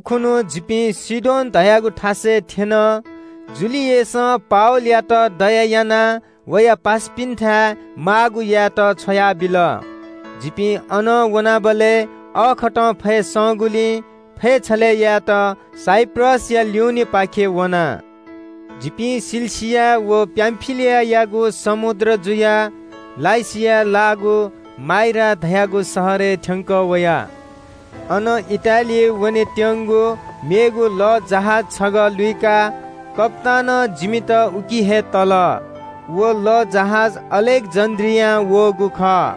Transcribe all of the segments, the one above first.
कन्‍हय् खुन्‍हु जिपिं सीदोन धयागु लःजहाज दिकेगु थासय् थ्‍यन। युलियसं पावलयात दया यानाः वया पासापिन्‍थाय् माःगु यायेत छ्वयाबिल। जिपिं अनं वनाबलय् अःखतं फय् संगुलिं फय् छलय्‌ यायेत साइप्रसया उत्तरपाखें वना। जिपिं किलिकिया व पामफिलियायागु समुद्र जुयाः लुकियाय् लाःगु माइरा धाःगु शहरय् थ्‍यंकः वया। अन इटालियाय् वनेत्‍यंगु मेगु लःजहाज छगः लुइकाः कप्‍तानं जिमित उकी हे तल। व लःजहाज अलेक्‍जेन्‍ड्रियां वःगु खः।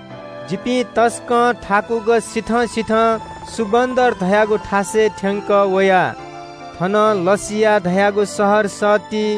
जिपिं तसकं थाकुक सिथं सिथं सुन्‍दर बन्‍दर धाःगु थासय् थ्‍यंकः वया। थनं लासिया धाःगु शहर सत्ति।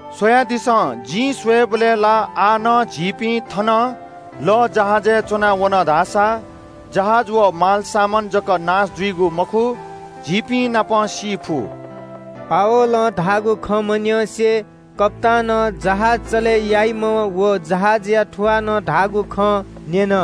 “स्‍वयादिसँ, जिं स्‍वयेबलय् ला आः नं झीपिं थनं लःजहाजय् च्‍वना वन धाःसा जहाज व मालसामान जक नाश जुइगु मखु, झीपिंनापं सी फु।” पावलं धाःगु खँ मन्‍यंसे कप्‍तानं जहाज चले याइम्‍ह व जहाजया थुवालं धाःगु खँ न्‍यन।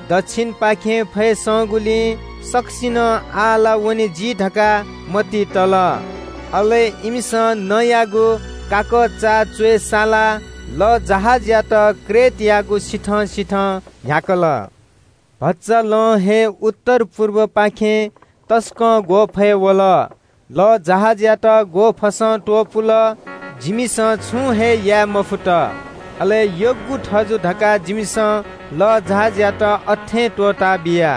दच्‍छिनपाखें फय् संगुलिं सकसिनं आः ला वने जी धकाः मतिइ तल। अले इमिसं नँयागु काकःचा च्‍वय् सालाः लःजहाजयात क्रेट टापुयागु सिथं सिथं न्‍ह्याकल। तर भचा लं हे टापुपाखें उत्तर पुर्बय् नं तसकं ग्‍वःफय् वल। लःजहाजयात ग्‍वःफसं त्‍वपुल, जिमिसं छुं हे याये मफुत। अले यग्‍गु थजु धकाः जिमिसं लःजहाजयात अथें त्‍वःताबिया।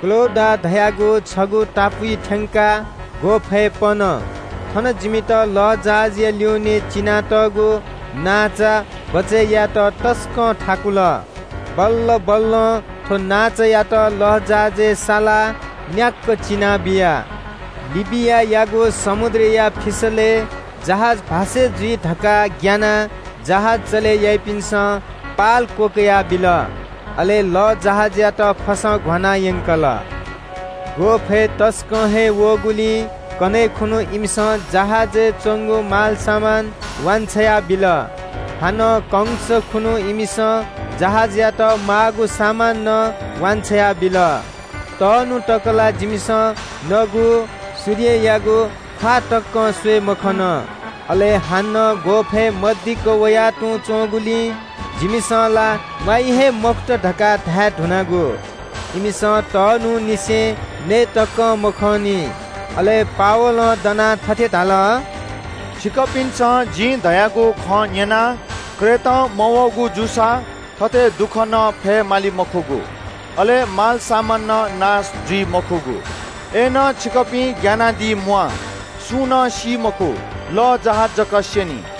क्‍लौडा धाःगु छगू टापुइ थ्‍यंकाः ग्‍वःफय्‌यात भचा पन। अथेजूसां जिमित लःजहाजया ल्‍युने चिनातःगु नांचा बचय् यायेत तसकं थाकुल। बल्‍ल बल्‍लं थ्‍व नांचायात लःजहाजय् सालाः न्‍याक्‍क चिना बिया। लिबियायागु समुद्रया फिसलय् जहाज भास्‍से जुइ धकाः ग्‍यानाः जहाज चले याइपिन्‍सं पाल क्‍वकयाबिल। अले लःजहाजयात फसं घ्‍वाना यंकल। ग्‍वःफय् तसकं हे वःगुलिं कन्‍हय् खुन्‍हु इमिसं जहाजय् च्‍वंगु मालसामान वान्‍छ्वया बिल। हानं कंस खुन्‍हु इमिसं जहाज चले यायेत माःगु सामान नं वान्‍छ्वया बिल। तःन्‍हु तक ला जिमिसं नगु व सूर्य तकं स्‍वये मखन। अले हानं ग्‍वःफय् मदिक्‍क वया तुं च्‍वंगुलिं जिमिसं ला म्‍वाइ हे मखुत धकाः धाये धुनागु। तःन्‍हुंनिसें नये तकं मखंनाः पावलं दनाः थथे धाल – “छिकपिन्‍सं जिं धयागु खँ न्‍यनाः क्रेटं मवःगु जूसा थथे दुःख नं फयेमाली मखुगु, अले मालसामान नं नाश जुइ मखुगु। अय्‌नं छिकपिं ग्‍यानादी म्‍वाः। सुं नं सी मखु। लःजहाज जक स्‍यनी।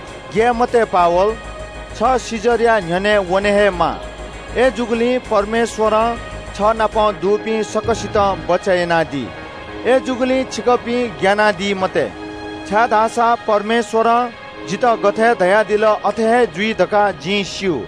‘ग्‍याये मते पावल, छ कैसरया न्‍ह्यःने वने हे माः। अय्‌जूगुलिं परमेश्‍वरं छ नाप दुपिं सकसितं बचय् यानादी।’ थथे छिकपिं ग्‍यानादी मते, छाय्‌धाःसा परमेश्‍वरं जितः गथे धयादिल अथे हे जुइ धकाः जिं स्‍यू।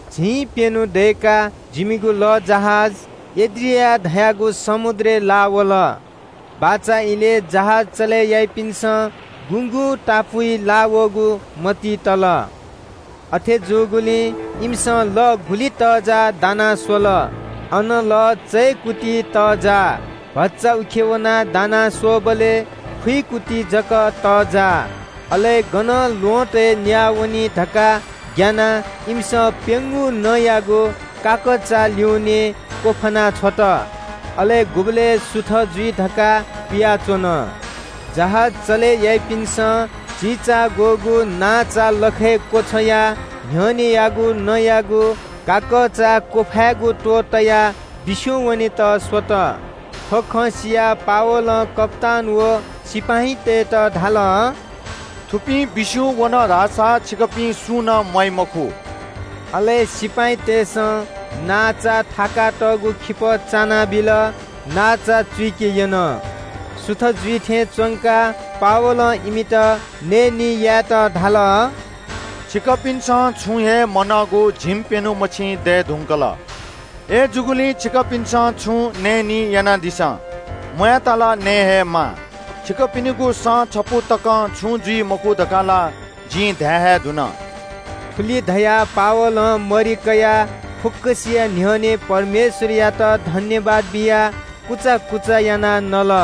झिंप्‍यन्‍हु दय्‌काः जिमिगु लःजहाज एड्रियास धाःगु समुद्रय् लाः वल। बाचा इलय् जहाज चले याइपिन्‍सं गुगुं टापुइ लाःवःगु मतिइ तल। अथे जूगुलिं इमिसं लः गुलि तःजाः दाना स्‍वल। अन लः स्‍विखुगू मिटर तःजाः। भचा उखे वनाः दाना स्‍वःबलय् निइन्‍हय्‌गू मिटर ति जक तःजाः। अले गनं ल्‍वहँतय् न्‍याः वनी धकाः ग्‍यानाः इमिसं प्‍यंगू नँयागु काकःचा ल्‍यूनें क्‍वफाना छ्वल। अले गुबलय् सुथ जुइ धकाः पियाच्‍वन। जहाज चले याइपिन्‍सं चिचाग्‍वःगु नांचा लखय् क्‍वछ्वयाः न्‍ह्यःनेयागु नँयागु काकःचा क्‍वफायेगु त्‍वहः तयाः बिस्‍युं वनेत स्‍वल। थ्‍व खँ सियाः पावलं कप्‍तान व सिपाइँतय्‌त धाल – “थुपिं बिस्‍युं वन धाःसा छिकपिं सुं नं म्‍वाइ मखु।” अले सिपाइँतय्‌सं नांचा थाकातःगु खिपः चानाबिल। नांचा चुइके यन। सुथ जुइ थें च्‍वंकाः पावलं इमित नयेनी यायेत धाल – “छिकपिन्‍सं छुं हे मनःगु झिंप्‍यन्‍हु मछिं दये धुंकल। अय्‌जूगुलिं छिकपिन्‍सं छुं नयेनी यानादिसँ। म्‍वायेत ला नये हे माः। छिकपिनिगु सँ छपु तकं छुं जुइ मखु धकाः ला जिं धाये हे धुन।” थुलि धयाः पावलं मरि कयाः फुक्‍कसिया न्‍ह्यःने परमेश्‍वरयात सुभाय् बियाः कुचा कुचा यानाः नल।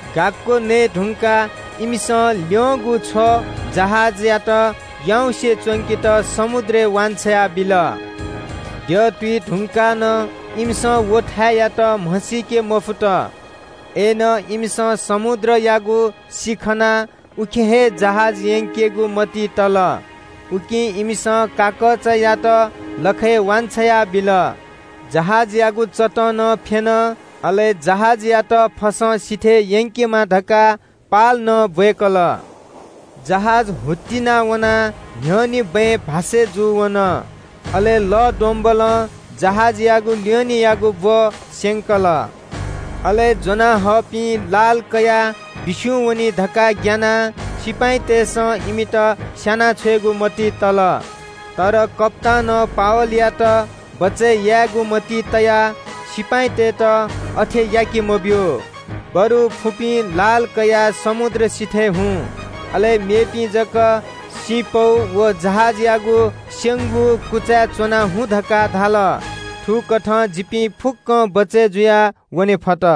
गाक्‍क नये धुंकाः इमिसं ल्‍यंगु छ्व जहाजयात याउँसे च्‍वंकेत समुद्रय् वान्‍छ्वया बिल। सुथ जुइ धुंकाः नं इमिसं व थाय्‌यात म्‍हसीके मफुत। अय्‌नं इमिसं समुद्रयागु सि खनाः उखे हे जहाज यंकेगु मतिइ तल। उकिं इमिसं काकःचायात लखय् वान्‍छ्वया बिल, जहाजयागु चतं नं फ्‍यन, अले जहाजयात फसं सिथय् यंकेमा धकाः पाल नं ब्‍वय्‌कल। जहाज हुत्तिना वनाः न्‍ह्यःने बँय् भास्‍से जूवन, अले लः द्वंब्‍वलं जहाजयागु ल्‍यूनेयागु ब्‍व स्‍यंकल। अले ज्‍वनाहःपिं लाल कयाः बिस्‍युं वनी धकाः ग्‍यानाः सिपाइँतय्‌सं इमित स्‍याना छ्वयेगु मतिइ तल। तर कप्‍तानं पावलयात बचय् यायेगु मतिइ तयाः सिपाइँतय्‌त अथे याके मब्‍यू, बरु फुपिं लाल कयाः समुद्र सिथय् हुँ। अले मेपिं जक सिँपौ व जहाजयागु स्‍यंगु कुचाय् च्‍वनाः हुँ धकाः धाल। थुकथं जिपिं फुक्‍कं बचय् जुयाः वने फत।